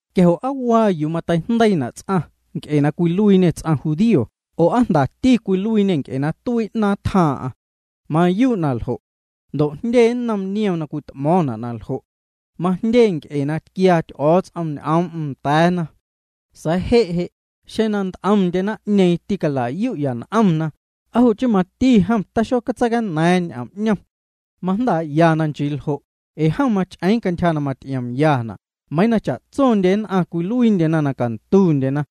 Quia jo' ¿aa waa yuu mateijndeiitina' ts'aⁿ nc'e cwiluiiñê ts'aⁿ judío oo aa jndati cwiluiiñê nc'e na tuii 'naaⁿ tjaaⁿ'aⁿ? Mayuu' na ljo'. Ndo' jndye nnom niom na cwit'mo̱o̱ⁿna' na ljo'. Najndyee nc'e na tquiaa Ty'o̱o̱ts'om ñ'oom'm nda̱a̱na. Sa̱a̱ je' je', xeⁿ na nt'omndye naⁿ'ñeeⁿ tîcala'yu'ya n'omna, ¿aa jo' chii mati jom taxotseicana̱a̱ⁿ ñ'oom 'ñom? Majndaa'ya na nchii ljo' ee jom mach'eeⁿ cantyja na maty'iomyana' meiiⁿ na cha'tso nn'aⁿ cwiluiindyena na cantundyena.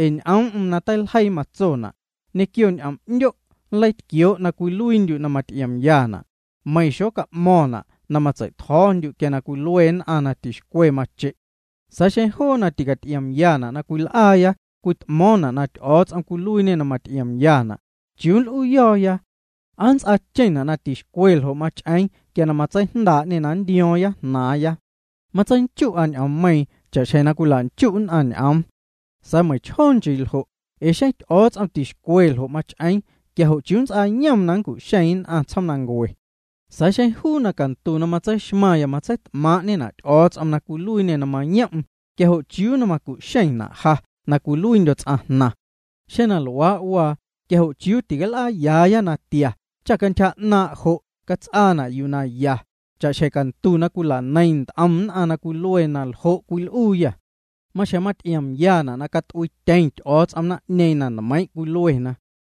Ee ñ'oom'm na teilejii matsona': Ñequio ñ'om'ndyo' nleitquioo' na cwiluiindyu' na maty'iomyana'. Meiⁿ xoca'mo̱ⁿna' na matsei'tjo̱o̱ndyu' quia cwilue nn'aⁿ na tixcwe mache'. Sa̱a̱ xeⁿ joo na ticaty'iomyana' na cwil'aaya cwit'mo̱o̱ⁿna' na Ty'o̱o̱ts'om cwiluiiñê na maty'iomyana', ¿chiuu nl'uuyo̱o̱ya? ¿Aa nnts'aacheⁿna' na tixcwe ljo' mach'eeⁿ quia na matseijndaa'ñê na nntio̱o̱ⁿya jnaaⁿya? Matseinchu'a ñ'oommeiiⁿ cha'xjeⁿ na cwila'nchu' nn'aⁿ ñ'oom. Sa̱a̱ meiⁿchjoo nchii ljo', ee xeⁿ Ty'o̱o̱ts'om tixcwe ljo' mach'eeⁿ quia jo' ¿chiuu nnts'aayom na nncu'xeeⁿ nn'aⁿ tsjoomnancue? Sa̱a̱ xeⁿ juu na cantu na matseixmaⁿya matseit'maaⁿ'ñena' Ty'o̱o̱ts'om na cwiluiiñê na mayom'm, quia jo' ¿chiuu na macu'xeⁿna' ja na cwiluiindyo̱ ts'aⁿ jnaⁿ? Xeⁿ na luaa' waa quia jo' chiuu tical'aayaaya natia cha cantyja 'naaⁿ' jo' cats'aana' yuu na ya, cha'xjeⁿ cantu na cwila'neiⁿ nt'om nn'aⁿ na cwilue na ljo' cwil'uuyâ. Maxjeⁿ maty'iomyana' na cat'uiityeⁿ Ty'o̱o̱ts'om naⁿ'ñeeⁿ na nmeiiⁿ' cwiluena.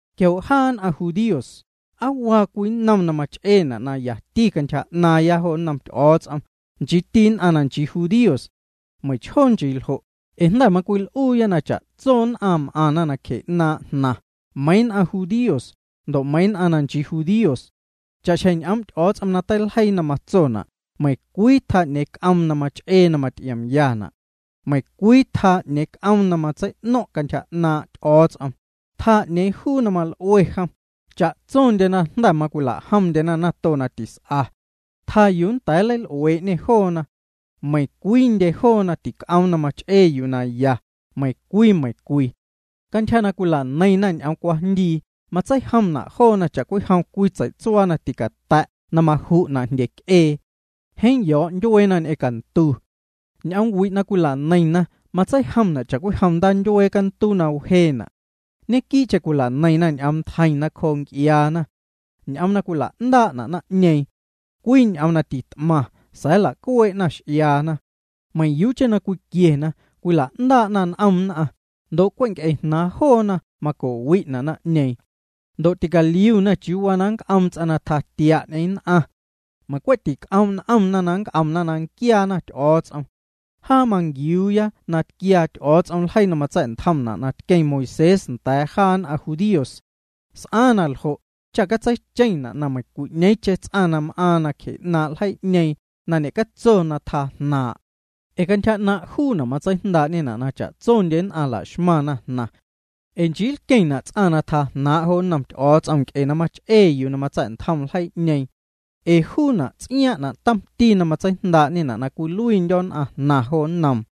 Quia jo' jaa nn'aⁿ judíos, ¿aa waa cwii nnom na mach'eena' na yati cantyja 'naaⁿya jo nnom Ty'o̱o̱ts'om, nchiiti nn'aⁿ na nchii judíos? Meiⁿchjoo nchii jo', ee jnda̱ macwil'uuya na cha'tso nn'aⁿ m'aⁿna nacje 'naaⁿ' jnaⁿ, meiiⁿ nn'aⁿ judíos, ndo' meiiⁿ nn'aⁿ na nchii judíos. Cha'xjeⁿ ñ'oom' Ty'o̱o̱ts'om na teiljeii na matsona': Meiⁿcwii tjaa 'ñeeⁿ juu c'oom na mach'ee na maty'iomyana'. Meiⁿcwii tjaa 'ñeeⁿ c'oom na matsei'no̱ⁿ' cantyja 'naaⁿ' Ty'o̱o̱ts'om. Tjaa 'neeⁿ juu na mal'ue jom. Cha'tsondyena jnda̱ macwila'jomndyena nato na tis'a. Tjaa yuu nnda̱a̱ na nleil'uee'ñê joona. Meiⁿcwiindye joona tic'oom na mach'ee yuu na ya, meiⁿcwii, meiⁿcwii. Cantyja na cwila'neiⁿna ñ'oom cwajndii, matseijomna' joona cha'cwijom cwii tsei'tsuaa na ticata̱' na maju'na' jndye c'ee. Jeeⁿ yo̱o̱' ndyueena ñ'eⁿ cantu. Ñ'oom wi' na cwila'neiⁿna matseijomna' cha'cwijom ndaa ndyuee canduu na wjeena'. Ñequii'cheⁿ cwila'neiⁿna ñ'oom ntjeiⁿ nacjoo nc'iaana. Ñ'oom na cwila'ndaa'na' naⁿ'ñeeⁿ. Cwii ñ'oom na tit'maⁿ sa̱a̱ nla'cuee'na x'iaana. Meiⁿyuucheⁿ na cwiquiena, cwila'ndaa'na n'om nn'aⁿ, ndo' cwe' nc'e jnaaⁿ joona maco'wi'na' naⁿ'ñeeⁿ. Ndo' ticaliuna chiuu waa na nnc'oom ts'aⁿ na tjaa tia' ñ'eⁿ nn'aⁿ. Meiⁿ cwe' tic'oom' n'omna na nnc'omna na nquiaana Ty'o̱o̱ts'om. Jaa manquiuuya na tquiaa Ty'o̱o̱ts'om ljeii na matsa̱'ntjomna' na tqueⁿ Moisés nda̱a̱ jaa nn'aⁿ judíos. S'aaⁿ na ljo' cha catseicheⁿna' meiⁿcwi'ñeeⁿcheⁿ ts'aⁿ na m'aaⁿ nacje 'naaⁿ' ljeii'ñeeⁿ na ñe'catso na tjaa jnaaⁿ'. Ee cantyja 'naaⁿ' juuna' matseijndaa'ñê na cha'tsondye nn'aⁿ la'xmaⁿna jnaⁿ. Ee nchii nlqueⁿna' ts'aⁿ na tjaa jnaaⁿ' jo nnom Ty'o̱o̱ts'om nc'e na mach'ee yuu na matsa̱'ntjom ljeii'ñeeⁿ. Ee juuna' ts'iaaⁿ'na' tomti na matseijndaa'ñena' na cwiluiindyo̱ nn'aⁿjnaⁿ jo nnoom.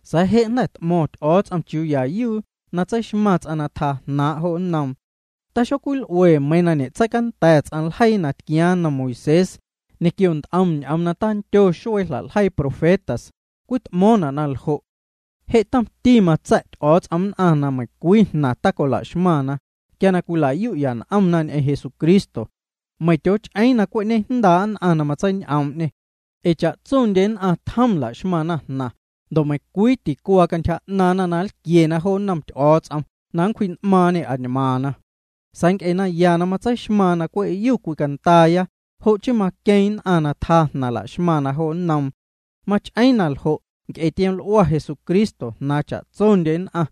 Sa̱a̱ je' jnda̱ t'mo̱ⁿ Ty'o̱o̱ts'om chiuu ya yuu na tseixmaⁿ ts'aⁿ na tjaa jnaaⁿ' jo nnoom, taxocwil'ue meiiⁿ na ñe'tseicanda̱ ts'aⁿ ljeii na tquiaaⁿ nnom Moisés ñequio nt'om ñ'oom na tandyo xuee jla'ljeii profetas, cwit'mo̱o̱ⁿna' na ljo'. Je' tomti matsa̱' Ty'o̱o̱ts'om nn'aⁿ na meiⁿcwii jnaⁿ tacola'xmaⁿna, quia na cwila'yuya n'omna ñ'eⁿ Jesucristo. Meiⁿ tyooch'eeⁿ na cwe' ñejndaa' nn'aⁿ na matseiñ'oom'ñê. Ee cha'tsondyeñ'eⁿ nn'aⁿ tjom la'xmaⁿna jnaⁿ, ndo' meiⁿcwii ticuaa cantyja 'naaⁿna na nlquiena jo nnom Ty'o̱o̱ts'om na nncwji'n'maaⁿñê añmaaⁿna. Sa̱a̱ nc'e naya na matseixmaaⁿ na cwe'yu cwicandaaya, jo' chii maqueeⁿ nn'aⁿ na tjaa jnaⁿ laxmaⁿna jo nnoom. Mach'eeⁿ na ljo' nc'e tioml'ua Jesucristo jnaaⁿ cha'tsondye nn'aⁿ.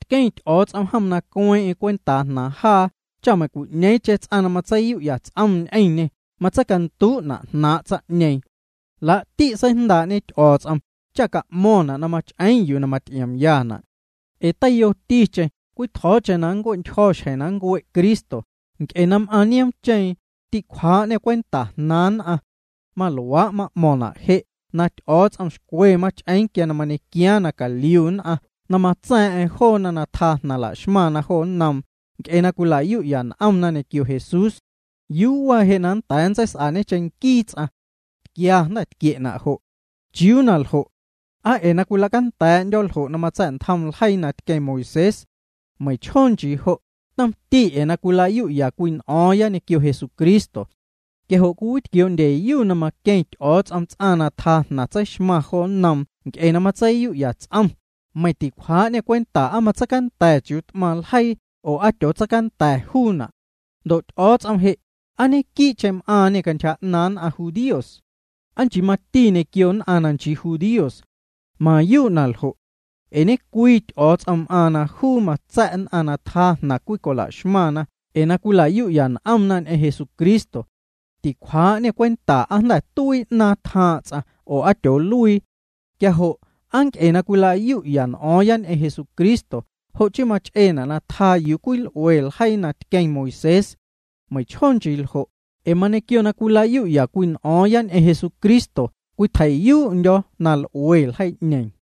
Tqueⁿ Ty'o̱o̱ts'om jom na cueeⁿ'eⁿ cwentaa jnaaⁿ jaa cha meiⁿcwi'ñeeⁿcheⁿ ts'aⁿ na matseiyu'ya ts'om ñ'eⁿñê matseicanduu'na' jnaaⁿ' tsaⁿ'ñeeⁿ. Laa'ti' seijndaa'ñe Ty'o̱o̱ts'om cha ca'mo̱ⁿna' na mach'eeⁿ yuu na maty'iomyana'. Ee teiyoticheⁿ cwii tjo̱o̱cheⁿ na nncue'ntyjo̱ xjeⁿ na nncue' Cristo, nc'e na m'aaⁿ nioomcheeⁿ, tîcwjaa'ñê cwenta jnaaⁿ nn'aⁿ. Maluaa' ma'mo̱ⁿna' je', na Ty'o̱o̱ts'om xcwe mach'eeⁿ quia na mañequiaaⁿ na caliu nn'aⁿ na matsa̱a̱ⁿ'a̱ⁿ joona na tjaa jnaⁿ la'xmaⁿna jo nnoom, nc'e na cwila'yu'ya n'omna ñequio Jesús. ¿Yuu waa je' na nnda̱a̱ nntseis'añe cheⁿnquii ts'aⁿ? Tquia jnda̱ tquie'na' jo'. ¿Chiuu na ljo'? ¿Aa ee cwila'canda̱a̱'ndyo̱ ljo' na matsa̱'ntjom ljeii na tqueⁿ Moisés? Meiⁿchjoo nchii jo', tomti ee na cwila'yu'ya cwii n'o̱o̱ⁿya ñequio Jesucristo. Quia jo' cwiwitquioo'ndyeyu na maqueⁿ Ty'o̱o̱ts'om ts'aⁿ na tjaa jnaⁿ tseixmaⁿ jo nnoom nc'e na matseiyu'ya ts'om, meiⁿ ticwjaa'ñê cwenta aa matseicanda̱ chiuu t'maⁿ ljeii'ñeeⁿ oo aa tyootseicanda̱ juuna'. Ndo' Ty'o̱o̱ts'om je', ¿aa ñequiicheⁿ m'aaⁿñê cantyja 'naaⁿ nn'aⁿ judíos? ¿Aa nchii mati ñequio nn'aⁿ na nchii judíos? Mayuu' na ljo'. Ee ñecwii Ty'o̱o̱ts'om m'aaⁿ na juu matsa̱' nn'aⁿ na tjaa jnaⁿ cwii cola'xmaⁿ ee na cwila'yu'ya n'omna ñ'eⁿ Jesucristo. Ticwjaa'ñê cwenta aa jnda̱ tuii 'naaⁿ tjaaⁿ' ts'aⁿ oo aa tyooluii. Quia jo', ¿aa nc'e na cwila'yu'ya n'o̱o̱ⁿya ñ'eⁿ Jesucristo jo' chii mach'eena' na tjaa yuu cwil'ue ljeii na tqueⁿ Moisés? Meiⁿchjoo nchii jo', ee mañequio na cwila'yu'ya cwii n'o̱o̱ⁿya ñ'eⁿ Jesucristo cwitjei'yuu'ndyo̱ na l'ue ljeii'ñeeⁿ.